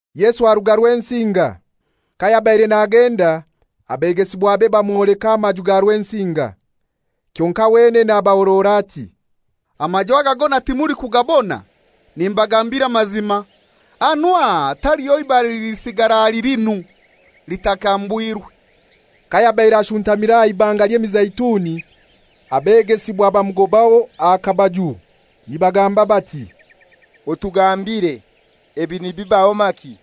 Yesu aruga Rwensinga. Kayabaire nagenda abegesibwabe bamwoleka amaju ga Rwensinga. Kyonkai wenene abahorora ati, «Amaju aga gona timulikugabona? Nimbagambira amazima, hanu aha taliho ibare lilisigara ahali linu, litakambwirwe.» Kayabaire ashuntamire aha Ibanga ly'Emizeituni, abegesibwa bamugobaho aha kabaju, nibagamba bati, «Otugambire, ebi nibibaho maki,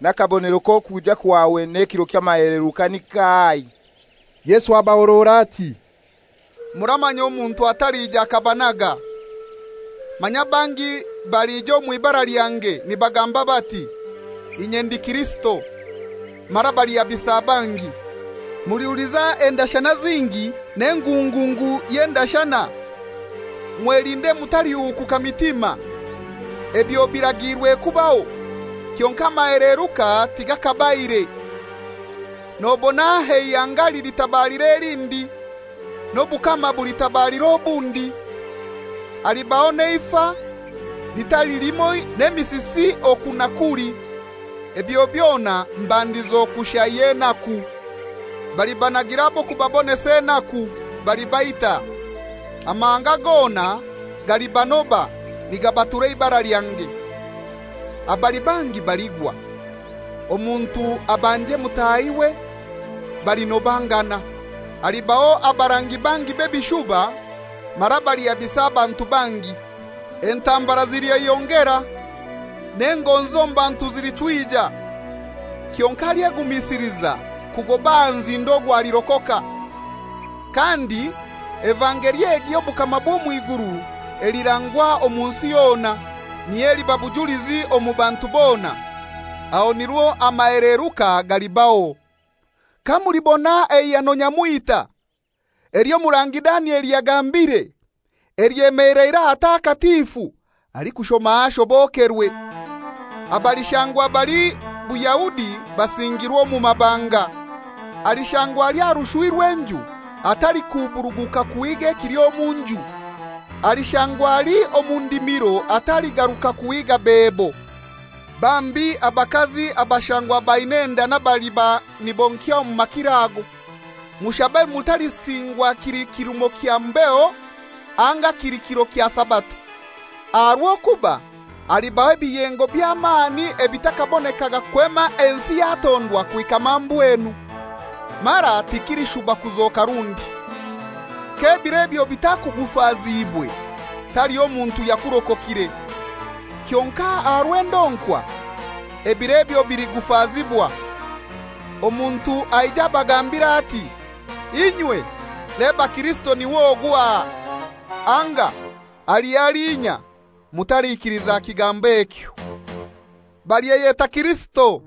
n'akabonero k'okwija kwawe n'ekiro ky'amaheleruka ni kahai?» Yesu abahorora ati, «Muramanya omuntu atalija akabanaga. Manya bangi balija omw'ibara lyange, nibagamba bati, ‹Inye ndi Kirisito,› mara balihabisa bangi. Mulihuliza endashana zingi n'engungungu y'endashana. Mwelinde mutalihukuka mitima; ebyo biragiirwe kubaho, kyonkai amaheleruka tigakabaire. Nobona eihanga lilitabalira elindi, n'obukama bulitabalira obundi, halibaho n'eifa litali limoi n'emisisi oku na kuli: ebyo byona mbandizo kushai y'enaku.» «Balibanagira ab'okubabonesa enaku, balibaita. Amahanga gona galibanoba nigabatura eibara lyange. Abali bangi baligwa, omuntu abanje mutahiwe, balinobangana. Halibaho abarangi bangi b'ebishuba mara balihabisa abantu bangi. Entambara zilyeyongera, n'engonzi omu bantu zilichwija. Kyonkai alyegumisiliza kugoba aha nzindo ogwo alirokoka. Kandi evangeli egi y'obukama bw'omw'iguru elirangwa omu nsi yona, niyo eliba bujulizi omu bantu bona; aho nirwo amaheleruka galibaho.» «Kamulibona eihano nyamwita, ely'omurangi Danieli yagambire, lyemeleire ahatakatifu (alikushoma ashobokerwe), abalishangwa bali Buyahudi basingirwe omu mabanga. Alishangwa ali aha rushwi rw'enju atalikuburuguka kuhiiga ekili omu nju. Alishangwa ali omu ndimiro ataligaruka kuhiiga bebo. Bambi abakazi abalishangwa baina enda n'abaliba nibonkya omu makiro ago! Mushabe mutalisingwa kili kirumo kya mbeho anga kili kiro kya Sabato. Aha rw'okuba halibaho ebiyengo by'amani ebitakabonekaga kwema ensi yatondwa kuhika mambwenu; mara tikilishuba kuzoka rundi. K'ebiro ebyo bitakugufaziibwe, taliho muntu yakurokokire. Kyonkai aha rw'endonkwa ebiro ebyo biligufazibwa. Omuntu aije abagambire ati, ‹Inywe, leba Kirisito niw'ogu aha!› Anga, ‹Ali halinya!› Mutalikiliza kigambo ekyo. Balyeyeta Kirisito,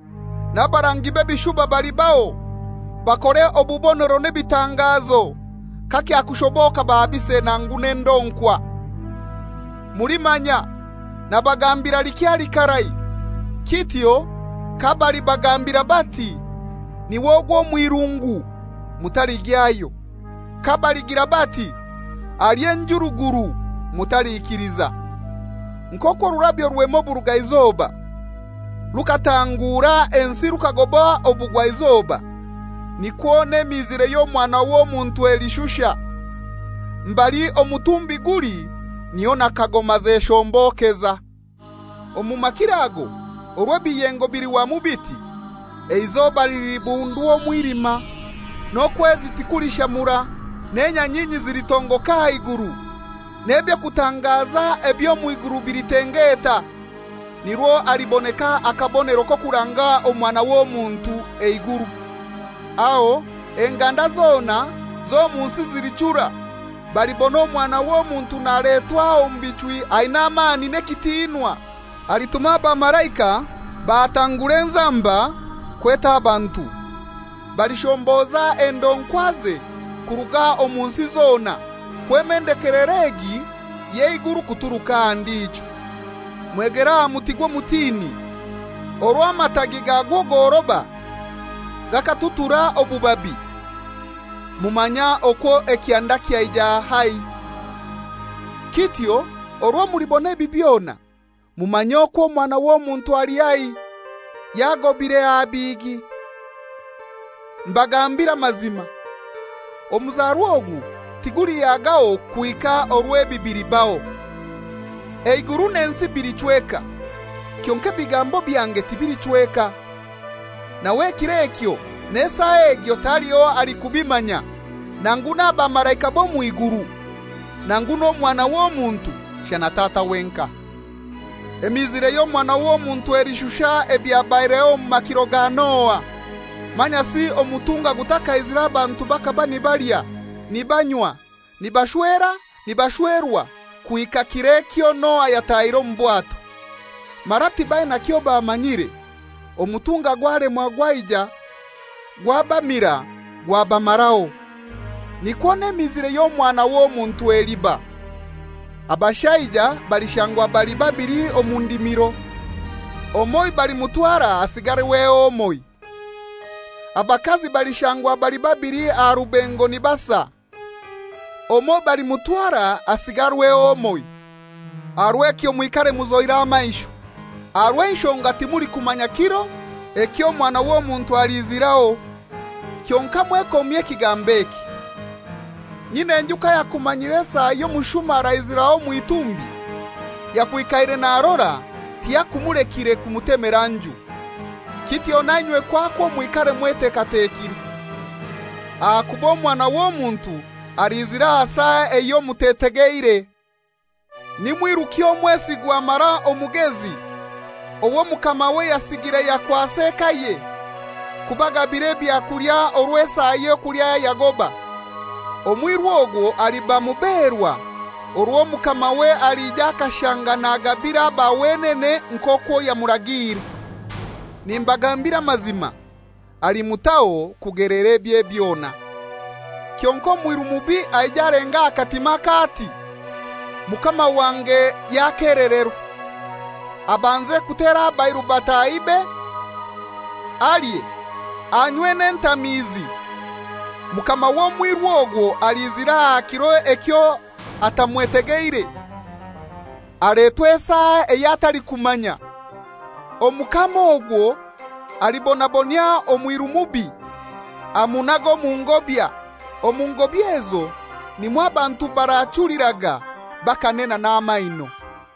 n'abarangi b'ebishuba balibaho, bakore obubonero n'ebitangazo, kakyakushoboka bahabise nangu n'endonkwa. Mulimanya, nabagambira likyali karai. Kityo kabalibagambira bati, ‹Niw'ogwo omw'irungu,› mutaligyayo. Kabaligira bati, ‹Ali enjuruguru,› mutalikiliza. Nk'okwo orurabyo rwema oburugaizoba rukaatangura ensi rukagoba obugwaizoba, nikwo n'emiizire y'Omwana w'Omuntu elishusha. Mbali omutumbi guli, niho na kagoma zeshombokeza.» «Omu makiro ago orwo ebiyengo bilihwamu biti, eizoba lilibundwa omwilima, n'okwezi tikulishamura, n'enyanyinyi zilitongoka aha iguru, n'eby'okutangaza eby'omw'iguru bilitengeta. Nirwo haliboneka akabonero k'okuranga Omwana w'Omuntu eiguru, aho enganda zona z'omu nsi zilichura, balibona Omwana w'Omuntu naletwa omu bichwi aina amani n'ekitinwa. Alituma abamalaika batangure enzamba kweta abantu, balishomboza endonkwaze kuruga omu nsi zona, kwema ndekelero egi y'eiguru kuturuka aha ndijo.» «Mwegere aha muti gw'omutini: Orwo amatagi gagwo goroba, gakatutura obubabi, mumanya okwo ekyanda kyaija haihi. Kityo orwo mulibona ebi byona, mumanye okwo Omwana w'Omuntu ali haihi, yagobire aha bihigi. Mbagambiire amazima, omuzarwa ogu tigulihagaho kuhika orwo ebi bilibaho. Eiguru n'ensi bilichweka, kyonkai ebigambo byange tibilichweka.» «Nawe ekiro ekyo n'esaa egyo taliho alikubimanya, nangu n'abamalaika b'omw'iguru, nangu n'Omwana w'Omuntu, shana Tata wenkai. Emiizire y'Omwana w'Omuntu elishusha ebyabaireho omu makiro ga Noa. Manyasi omutunga gutakaizire abantu bakaba nibalya, nibanywa, nibashwera, nibashwerwa, kuhika kiro ekyo Noa yatahiire omu bwato. Mara tibaina kyobamanyire, omutunga gwalemwa gwaija gwabamira gwabamaraho, nikwo n'emiizire y'Omwana w'Omuntu eliba. Abashaija balishangwa bali babili omu ndimiro, omoi balimutwara hasigarweho omoi. Abakazi balishangwa bali babili aha rubengo nibasa, omoi balimutwara hasigarweho omoi. Aha rw'ekyo mwikare muzoire amaisho, aha rw'enshonga timulikumanya kiro eky'Omwana w'Omuntu aliiziraho. Kyonkai mwekomye ekigambo eki: Nyin'enju kayakumanyire esaa ey'omushuma araiziraho omw'itumbi, yakwikaire narora tiyakumulekire kumutemera nju. Kityo nainywe kwakwo mwikare mwetekatekire; ahakuba rw'okuba Omwana w'Omuntu aliizira aha saa eyo mutetegeire.» «Ni mwiruki omwesigwa mara omugezi owo mukamawe yasigire yakwasa ekaye kubagabira ebyakulya orwo esaa y'okulya yagoba? Omwiru ogwo aliba muberwa orwo mukamawe alija akashanga nagabira aba wenene nk'okwo yamuragiire. Nimbagambira amazima, alimutaho kugelera ebye byona. Kyonkai omwiru mubi aije alenge aha katimake ati, ‹Mukama wange yakelererwa,› abanze kutera abairu batahibe, alye, anywe n'entamiizi, mukama w'omwiru ogwo aliizira aha kiro ekyo atamwetegeire, aletwe esaa ey'atalikumanya. Omukama ogwo alibonabonyia omwiru mubi, amunage omu ngobya; omu ngobya ezo nimwo abantu barachuliraga bakanena n'amaino.»